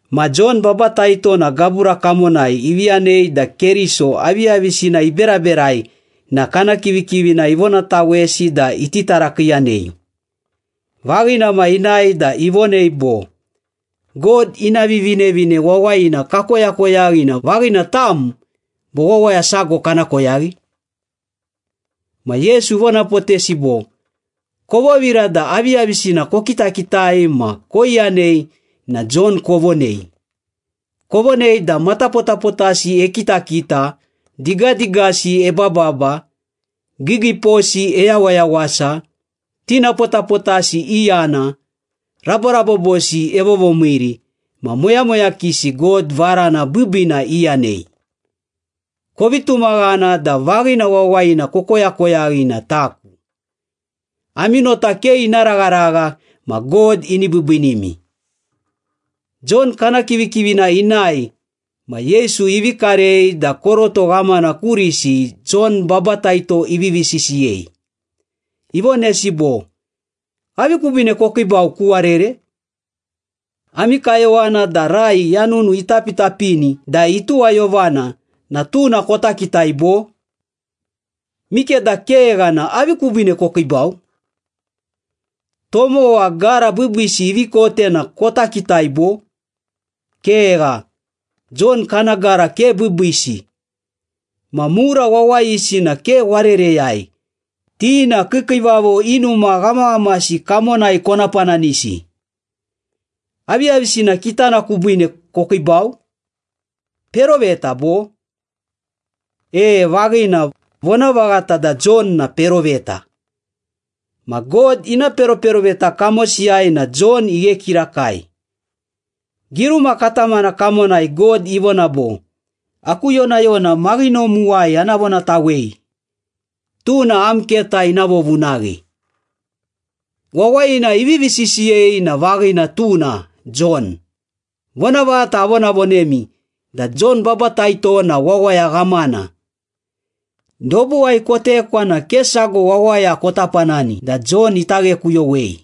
Ma Jon Babataito na gabura kamonai ivi yanei da Keriso aviyavisina iberaberai na kana kivikivina ivonatawesi da iti tarakiiyanei. Vaghina ma inae da ivonei bo, “God ina Vivinevine Wawayina kakoyakoyaghi na vaghina tam, bo wawaya sago kana koyaghi?” Ma Yesu ivonapotesi bo, “Kovovira da aviyavisina kokitakitai ma koiyanei na Jon kovonei. Kovonei da matapotapotasi ekitakita, digadigasi ebababa, giigiiposi eyawayawasa, tinapotapotasi iyana, raborabobosi evovomiiri, ma moyamoyakisi God varana biibiina iyanei. Kovi tumaghana da vaghina wawayina kokoyakoyaghi na taku. Ami nota ke ina ragharagha ma God ini biibiinimi.” Jon kana kivikivina inae ma Yesu ivi karei da koroto ghamana kurisi Jon Babataito ivivi sisiyei. Ivonesi bo, “Avi kubiine kokiibau ku warere? Ami kayowana da rai yanunu itapitapini da ituwayovana na tuna kota kitai, bo? Mikeda kegha na avi kubiine kokiibau? Tomowa gara biibiisi ivi kote na kota kitai, bo? Kegha, Jon kana gara ke biibiisi. Ma mura wawayisi na ke warereyai, ti na kiikiivavo i numa ghamaghamasi kamonai kona pananisi. Aviyavisina kitana kubiine kokiibau? Peroveta, bo? E, vaghina, vonavaghata da Jon na peroveta. Ma God ina peroperoveta kamosiyai na Jon ighe kirakai. Giruma katamana kamonai God ivona bo, ‘Aku yonayona maghinomuwai ana vonatawei. Tuna am keta ina vovunaghi.’ Wawayina ivivi sisiyei na vaghina tuna, Jon. Vonavaghata avonavonemi da Jon Babataito na wawaya ghamana. Dobuwai kotekwa na ke sago wawaya kota panani da Jon ita ghekuyowei.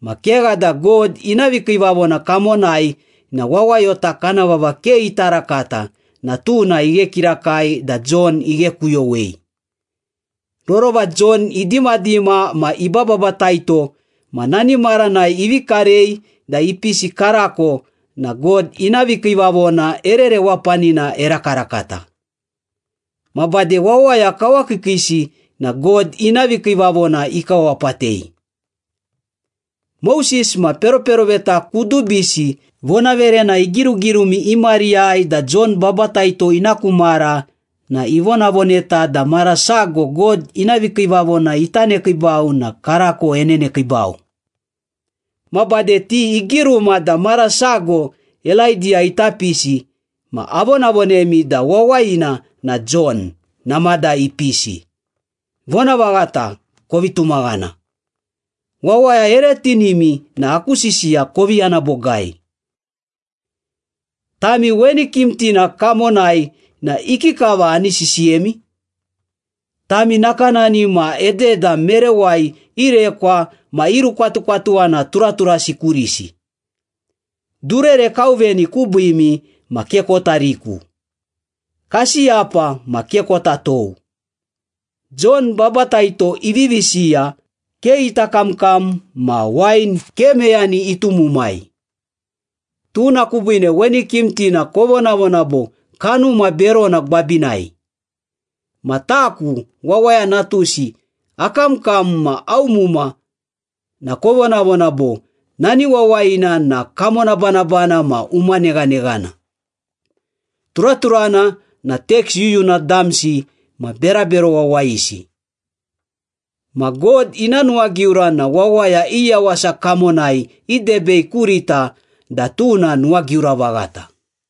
Ma kegha da God ina vikiivavona kamonai na wawayota kana vava ke ita rakata na tuna ighe kirakai da Jon ighekuyowei. Rorova Jon idimadima ma ibababataito ma nani maranai ivi karei da ipisi karako na God ina vikiivavona ere rewapanina erakarakata. Ma bade wawaya kawakiikiisi na God ina vikiivavona ikawapatei. Moses ma peroperoveta kudubisi vonaverena igirugirumi i mariyai da Jon Babataito ina ku mara na ivonavoneta da mara sago God ina vikiivavona ita nekiibau na karako enenekiibau. Ma bade ti igiruma da mara sago Elaidiya ita pisi, ma avonavonemi da wawayina na Jon, namada ipisi. Vonavaghata, kovi tumaghana. Wawaya ere tinimi na aku sisiya kovi yana bogai.” “Tami weni kimtina kamonai na ikikava ani sisiyemi? Tami nakanani ma ededa merewai irekwa ma irukwatukwatuwana turaturasi kurisi, ‘Durere kauveni kubiimi ma ke kota riku. Kasiyapa ma ke kota tou.’ Jon Babataito ivivi siya, ke ita kamkam ma wain ke meyani itumumai. Tuna kubiine weni kimtina kovonavona bo, ‘Kanuma berona gwabinai.’ Ma taku, Wawaya Natusi, akamkam ma aumuma na kovonavona bo, ‘Nani wawayina na kamonabanabana ma umaneghaneghana. Turaturana na teks yuyuna damsi ma berabero wawayisi.’ Ma God ina nuwagiura na wawaya i yawasa kamonai idebei kurita da tuna nuwagiura vaghata.”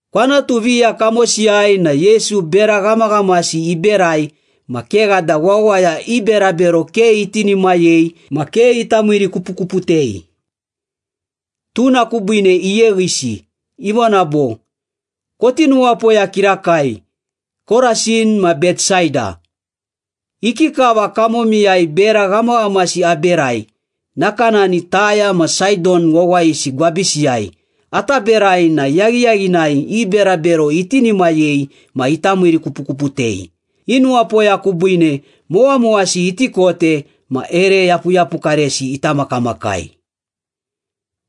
Kwanatu viya kamosiyai na Yesu bera ghamaghamasi iberai ma kegha da wawaya i berabero ke itinimayei ma ke ita miirikupukuputei. Tuna kubiine iyeghisi. Ivona bo, “Koti nuwapoya kirakai, Korasin ma Betsaida! Ikikava kamomiyai bera ghamaghamasi aberai, nakanani Taya ma Saidon wawayisi gwabisiyai ata berai na yaghiyaghinai i berabero itinimayei ma ita miirikupukuputei, i nuwapoya kubiine mowamowasi iti kote ma ere yapuyapukaresi ita makamakai.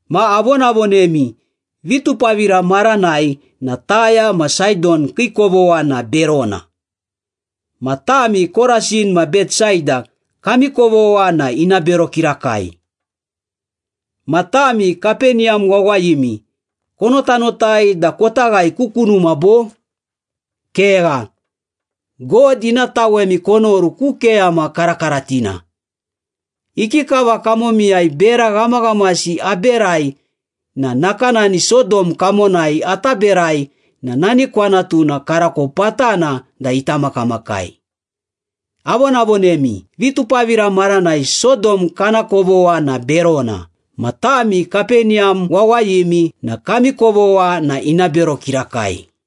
Ma avonavonemi, vitupavira maranai na Taya ma Saidon kii kovogha na berona. Ma tami Korasin ma Betsaida kami kovogha na ina bero kirakai. Ma tami Kapeniyam wawayimi, konotanotai da kota ghae ku kunuma, bo? Kegha! God ina tawemi konoru ku keyama karakaratina. Ikikava kamomiyai bera ghamaghamasi aberai na nakanani Sodom kamonai ata berai na nani kwanatuna karako patana da ita makamakai. Avonavonemi, vitupavira maranai Sodom kana kovogha na berona. Ma tami Kapeniyam wawayimi na kami kovogha na ina bero kirakai.”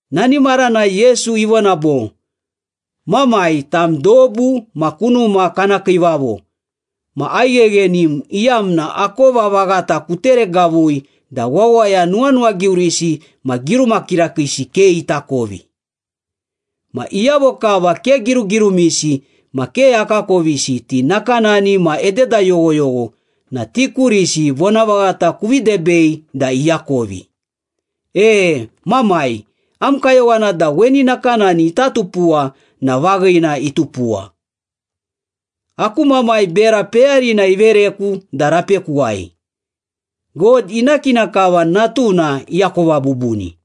Nani maranai Yesu ivona bo, “Mamai, tam dobu ma kunuma kana kiivavo ma aigheghenim iyamna akova vaghata kuteregavui da wawaya nuwanuwagiurisi ma giruma kirakiisi ke itakovi. Ma iyavo kava ke girugirumisi ma ke akakovisi, ti nakanani ma ededa yoghoyogho na ti kurisi vonavaghata kuvi debei da iakovi. E Mamai, am kayowana da weni nakanani ita tupuwa na vaghina, itupuwa.” “Aku Mamai bera peyarina ivereku da rapekuwai. God ina kina kava Natuna iakova bubuni.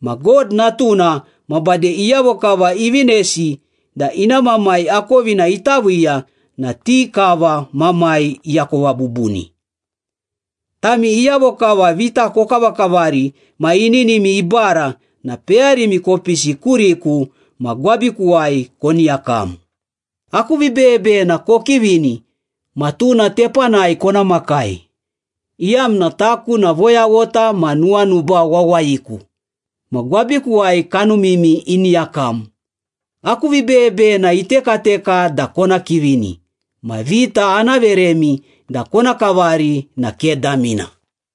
Ma God Natuna ma bade iyavo kava ivinesi da ina Mamai akovina ita viiya na ti kava Mamai iakova bubuni.” “Tami iyavo kava vita kokavakavari ma ininimi ibara na peyarimi kopisi kuriku ma gwabikuwai koni yakam. Aku vibeyebeyena kokivini ma tuna tepanai kona makai, iyamna taku na voyaghota ma nuwanuba wawayiku, ma gwabikuwai kanumimi ini yakam. Aku vibeyebeyena itekateka da kona kivini, ma vita ana veremi da kona kavari na ke damina.”